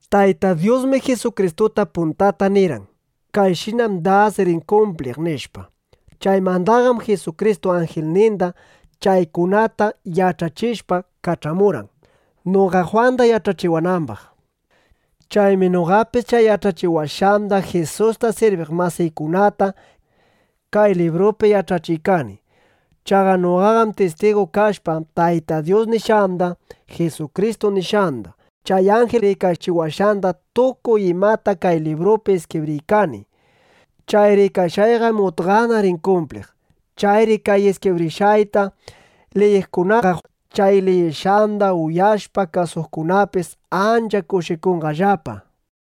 Tayta Dyusmi Jisukristuta puntata nirqan: “Kayshinam das rin kumpliq”, nishpa. Chaymandaqam Jisukristu anjilninda chaykunata yach'achishpa kach'amurqan, noqa Jwanda yach'achiwanambaq. Chaymi noqapis chay yach'achiwashqanda Jisusta sirbiq masiykunata kay librupi yach'achiykani. Chaqa noqaqam tistigu kashpa, Tayta Dyus nishqanda, Jisukristu nishqanda, chay anjil rikachiwashqanda tukuy imata kay librupi iskibriykani. Chay rikashqayqam utqana rin kumpliq. Chayri kay iskibrishqayta liyiqkunaqa, chay liyishqanda uyashpa kasuqkunapis ancha kushikunqallapa.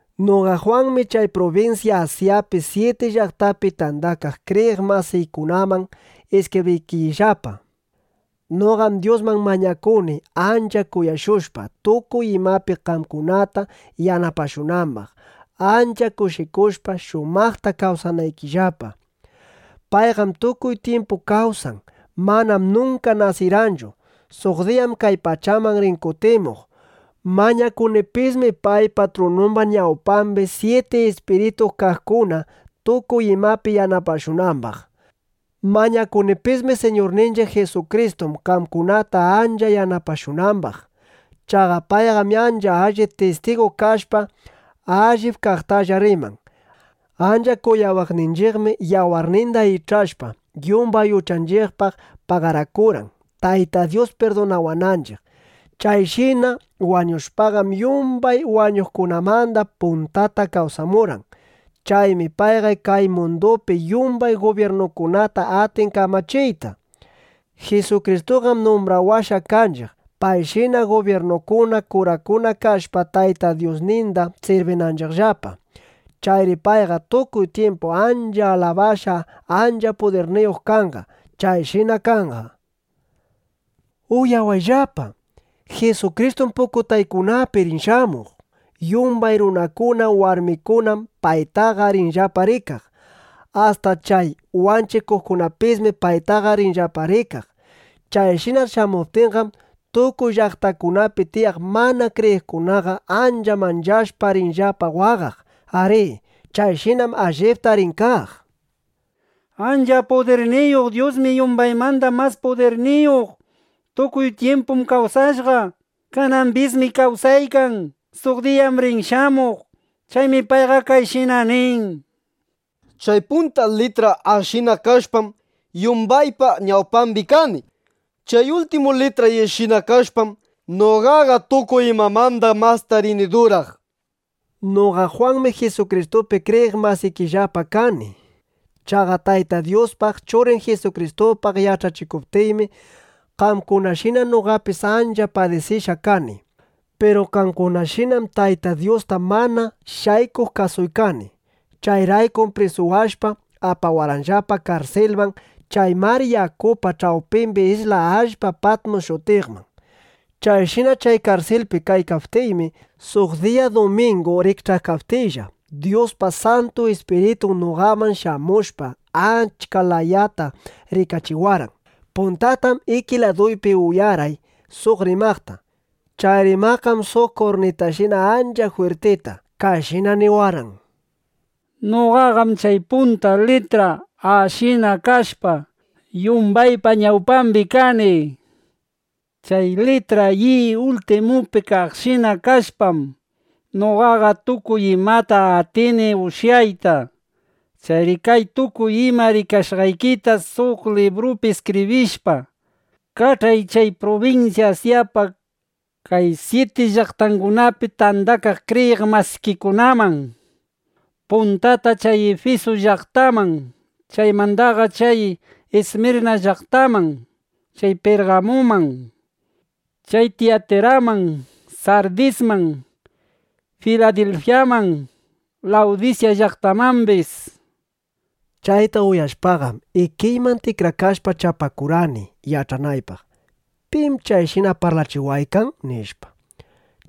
Noqa Jwanmi chay prubinsya Asyapi syiti llaqtapi tandakaq kriyiq masiykunaman iskibriykillapa. Noqam Dyusman mañakuni, ancha kuyashushpa, tukuy imapi qamkunata yanapashunambaq, ancha kushikushpa, shumaqta kawsanaykillapa. Payqam tukuy tyimpu kawsan. Manam nunka nasirqanchu. Suq diyam kay pachaman rin kutimuq. Mañakunipismi, paypa trunumba ñawpambi syiti ispiritu kaqkuna tukuy imapi yanapashunambaq. Mañakunipismi Siñurninchiq Jisukristuman, qamkunata ancha yanapashunambaq. Chaqa payqam ancha allin tistigu kashpa, allip kaqtalla riman. Ancha kuyawaqninchiqmi, yawarninda ich'ashpa, yumbay uchanchiqpaq pagarakurqan, Tayta Dyus pirdunawananchiq. Chayshina wañushpaqam, yumbay wañuqkunamanda puntata kawsamurqan. Chaymi payqa kay mundupi yumbay gubyirnukunata atin kamachiyta. Jisukristuqam numbrawashqa kanchiq, payshina gubyirnukuna, kurakuna kashpa, Tayta Dyusninda sirbinanchiqllapa. ¡Chayri payqa tukuy tyimpu ancha alabashqa, ancha pudirniyuq kanqa! Chayshina kanqa. ¡Uyawayllapa! ¡Jisukristum pukutaykunapi rin shamuq! Yumbay runakuna warmikunam paytaqa rinllapa rikaq. Asta chay wanchiqkunapismi paytaqa rinllapa rikaq. Chayshina shamuptinqam, tukuy llaqtakunapi tiyaq mana kriyiqkunaqa ancha manchashpa, rinllapa waqaq. Arí, chayshinam allipta rin kaq. Ancha pudirniyuq Dyusmi yumbaymanda mas pudirniyuq. Tukuy tyimpum kawsashqa. Kanambismi kawsaykan. Suq diyam rin shamuq. Chaymi payqa kayshina nin: —Chay punta litra “A”shina kashpam, yumbaypa ñawpambi kani. Chay ultimu litra “Y”shina kashpam, noqaqa tukuy imamanda masta rini duraq, nishpa. Noqa Jwanmi Jisukristupi kriyiq masikillapa kani. Chaqa Tayta Dyuspaq, Churin Jisukristupaq yach'achikuptiymi, qamkunashina noqapis ancha padisishqa kani. Piru qamkunashinam Tayta Dyusta mana shaykuq kasuykani. Chayraykum prisuwashpa, apawarqanllapa karsilman chay mar yakupa ch'awpimbi isla allpa Patmus shutiqman. Chayshina chay karsilpi kaykaptiymi, suq diya dumingu rikch'aykaptiylla, Dyuspa Santu Ispiritun noqaman shamushpa, achka layata rikachiwarqan. Puntatam iki laduypi uyarqay suq rimaqta. Chay rimaqqam suq kurnitashina ancha jwirtita kayshina niwarqan: —˻Noqaqam chay punta litra “A”shina kashpa, yumbaypa ñawpambi kani. Chay litra “Y” ultimupi kaqshina kashpam, noqaqa tukuy imata atini ushyayta.˼ Chayri kay tukuy ima rikashqaykita suq librupi iskibrishpa, kach'ay chay prubinsya Asyapa kay syiti llaqtangunapi tandakaq kriyiq masikikunaman: Puntata chay Ifisu llaqtaman, chaymandaqa chay Ismirna llaqtaman, chay Pirgamuman, chay Tiyatiraman, Sardisman, Filadilfyaman, Lawdisya llaqtamambis, nishpa. Chayta uyashpaqam, ikiyman tikrakashpa chapakurqani yach'anaypaq: ¿Pim chayshina parlachiwaykan? nishpa.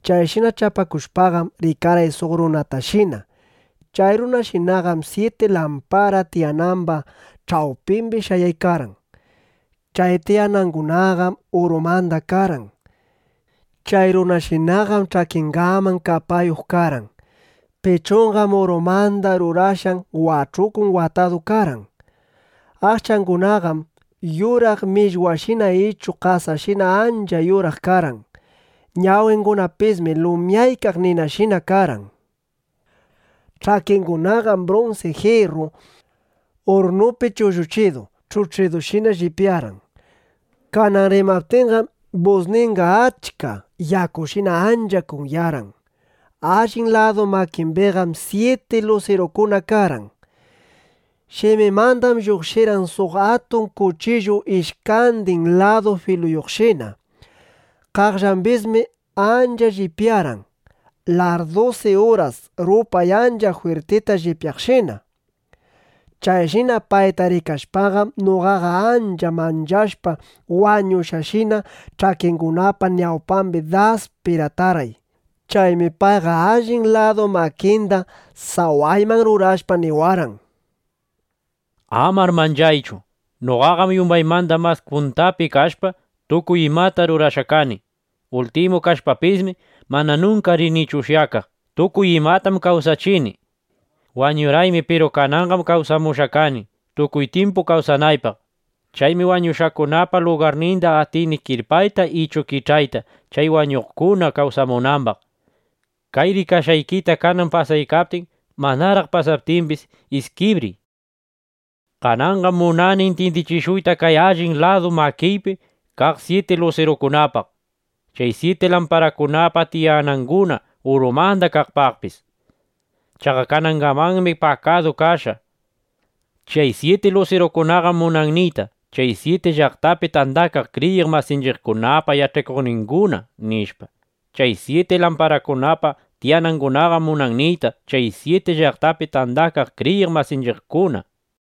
Chayshina chapakushpaqam, rikarqay suq runatashina. Chay runashinaqam syiti lampara tiyanamba ch'awpimbi shayaykarqan. Chay tiyanangunaqam urumanda karqan. Chay runashinaqam ch'akingaman kapayuq karqan. Pichunqam urumanda rurashqan wach'ukuwan watadu karqan. Aqchangunaqam yuraq millwashina ichu qasashina ancha yuraq karqan. Ñawingunapismi lumyaykaq ninashina karqan. Ch'akingunaqam brunsi jirru urrnupi chulluchidu ch'uch'idushina llipyarqan. Kanan rimaptinqam, busninqa achka yakushina ancha kunyarqan. Allin ladu makimbiqam syiti lusirukuna karqan. Shiminmandam lluqshirqan suq atun kuchillu ishkandin ladu filuyuqshina. Qaqllambismi ancha llipyarqan, larrdusi uras rupay ancha jwirtita llipyaqshina. Chayshina payta rikashpaqam, noqaqa ancha manchashpa wañushqashina ch'akingunapa ñawpambi das piratarqay. Chaymi payqa allin ladu makinda sawayman rurashpa, niwarqan: —Amar manchaychu. Noqaqam yumbaymanda mas puntapi kashpa, tukuy imata rurashqa kani. Ultimu kashpapismi, mana nunka rinichu ushyakaq. Tukuy imatam kawsachini. Wañurqaymi piru kananqam kawsamushqa kani, tukuy tyimpu kawsanaypaq. Chaymi wañushqakunapa lugarninda atini kirpayta ichu kich'ayta, chay wañuqkuna kawsamunambaq. Kay rikashqaykita, kanan pasaykaptin, manaraq pasaptimbis, iskibriy. Kananqam munani intyindichishuyta kay allin ladu makiypi kaq syiti lusirukunapaq, chay syiti lamparakunapa tiyananguna urumanda kaqpaqpis. Chaqa kanangamanmi pakadu kashqa. Chay syiti lusirukunaqam munan niyta chay syiti llaqtapi tandakaq kriyiq masinchiqkunapa yach'achikuqninguna, nishpa. Chay syiti lamparakunapa tiyanangunaqam munan niyta chay syiti llaqtapi tandakaq kriyiq masinchiqkuna, nishpa.